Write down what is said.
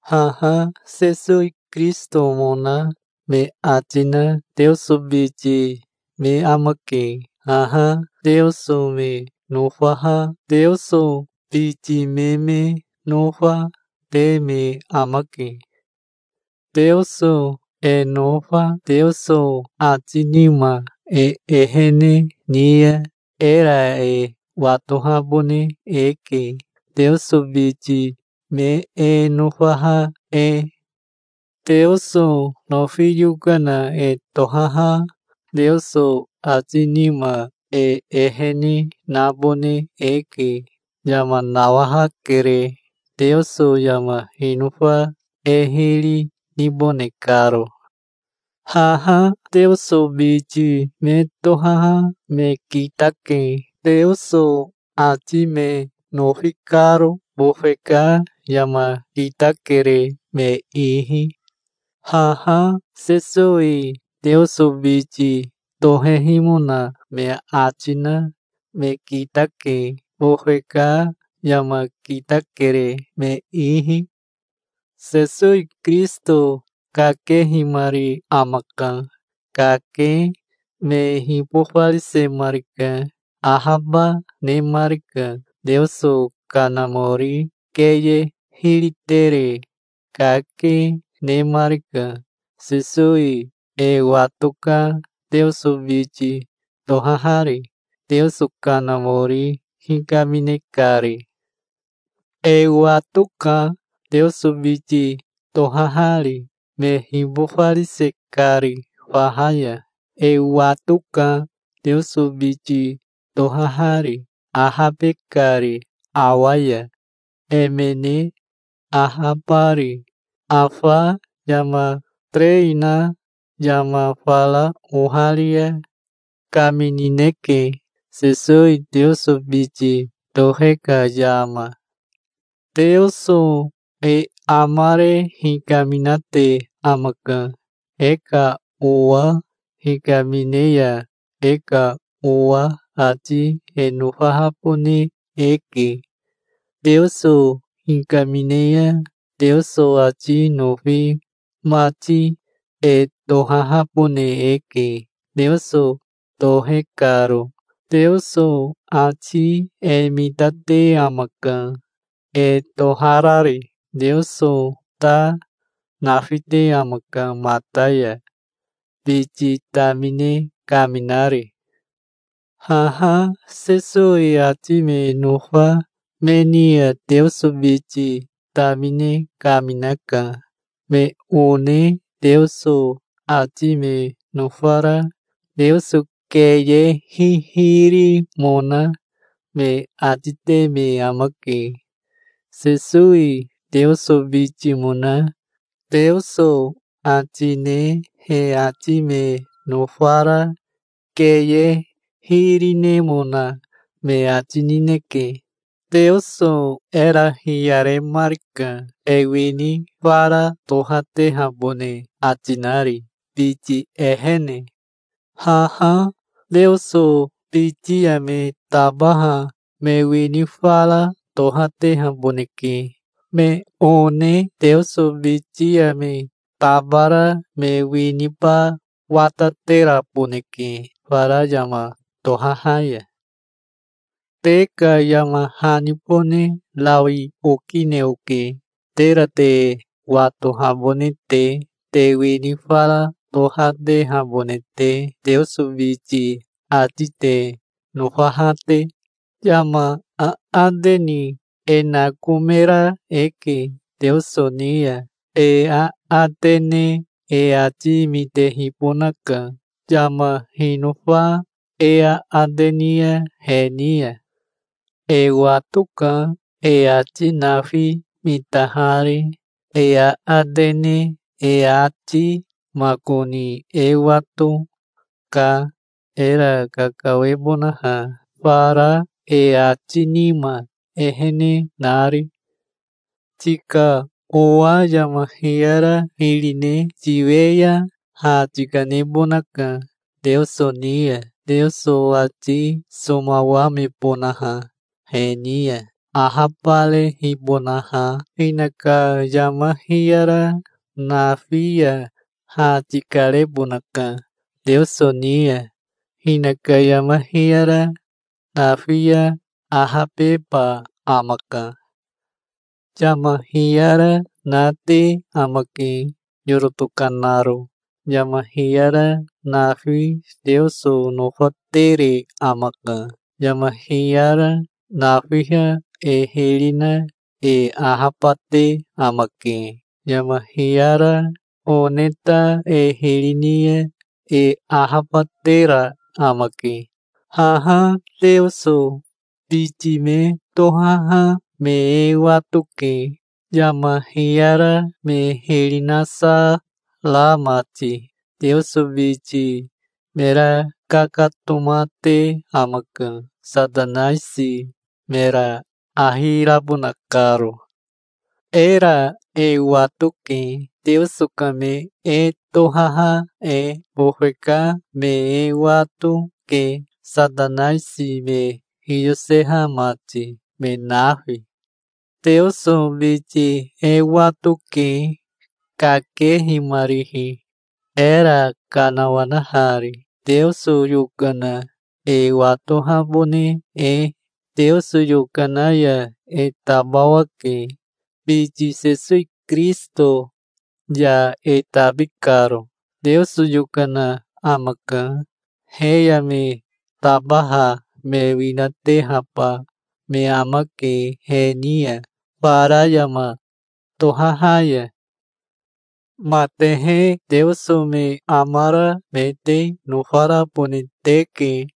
Haha Sesowi Kirisitomona me ati na Teoso biti me amake. Haha Teoso me nofaha Teoso biti me me nofa, te me amake. Teoso e nofa Teoso ati nima e ehene ni ya era e watohabone eke, Teoso biti me e nofaha e. Teoso nofi yokana e tohaha Teoso ati nima e ehene nabone eke. Yama nawahakere, Teoso yama hinofa e hiri nibone karo. Haha Teoso biti me tohaha me kitake, Teoso ati me nofi karo. Bofe ka yama kitakere me ihi. Haha Sesowi Teoso biti tohehimona me ati na me kitake. Bofe ka yama kitakere me ihi. Sesowi Kirisito kakehimari amaka. Kake me hibofarisemarika. Ahaba nemarika. Teoso Kanamori keye hiritere kake, nemarika. Sesowi e watoka, Teoso biti tohahari, Teoso Kanamori hikamine kari. E wato, ka, Teoso biti tohahari, me hibofarise kari faha ya. E wato, ka, Teoso biti tohahari, ahabe kari awa ya, emene ahabari. Afa yama terei na yama fara oharia kaminineke, Sesowi Teoso biti tohe ka yama. Teoso e amare hikaminate amaka. E ka owa hikamine ya e ka owa ati e nofahabone eke. Teoso hikamine ya Teoso ati nofi mati e tohahabone eke, Teoso tohe karo. Teoso ati e mitate amaka, e toharari. Teoso ta nafite amaka mata ya, biti tamine kaminari. Haha Sesowi ati me nofa me ni ya Teoso biti tamine kaminaka. Me one Teoso ati me nofara Teoso keye hihirimona me ati te me amake. Sesowi Teoso bitimona Teoso ati ne he ati me nofara keye hiri nemona me ati nineke. Teoso era hiyaremarika, e wini fara tohatehabone ati nari biti ehene. Haha Teoso biti ya me tabaha me wini fara tohatehaboneke. Me one Teoso biti ya me tabara me winiba watateraboneke fara yama tohaha ya. Te ka yama hanibone rawi okine oke, tera te watohabone te, te wini fara tohatehabone te, Teoso biti ati te nofaha te. Yama aate ni e nakomera eke Teoso ni ya. E aate ne e ati mitehibonaka, yama hinofa e aate ni ya he ni ya. E watoka, e ati nafi mitahari, e aate ne e ati. Makoni e wato, ka, era kakawebonaha, fara e ati nima ehene nari. Tika owa yama hiyara hiri ne tiwe ya ha tikanebonaka Teoso ni ya, Teoso ati somawamebonaha he ni ya, ahabarehibonaha. Hinaka yama hiyara nafi ya ha tikarebonaka Teoso ni ya. Hinaka yama hiyara nafi ya ahabeba amaka. Yama hiyara nate amake yoro tokanaro. Yama hiyara nafi Teoso nofatere amaka. Yama hiyara nafiha e hiri na e ahabate amake. Yama hiyara one ta e hiri ni ya e ahabatera amake. Haha Teoso biti me tohaha me e watoke, yama hiyara me hiri nasa ra mati. Teoso biti mera kakatomate amaka, Satanaisi mera ahi rabona karo. Era e watoke, Teoso ka me e tohaha e. Bofe ka me e wato, ke, Satanaisi me hiyoseha mati, me nafi. Teoso biti e wato, ke, kakehimarihi, era kanawanahari, Teoso yokana e watohabone e. Teoso yokana ya e tabawake, biti Sesowi Kirisito ya e tabi karo. Teoso yokana amaka. He ya me tabaha me winatehaba me amake he ni ya fara yama tohaha ya. Matehe Teoso me amara me te nofarabone teke.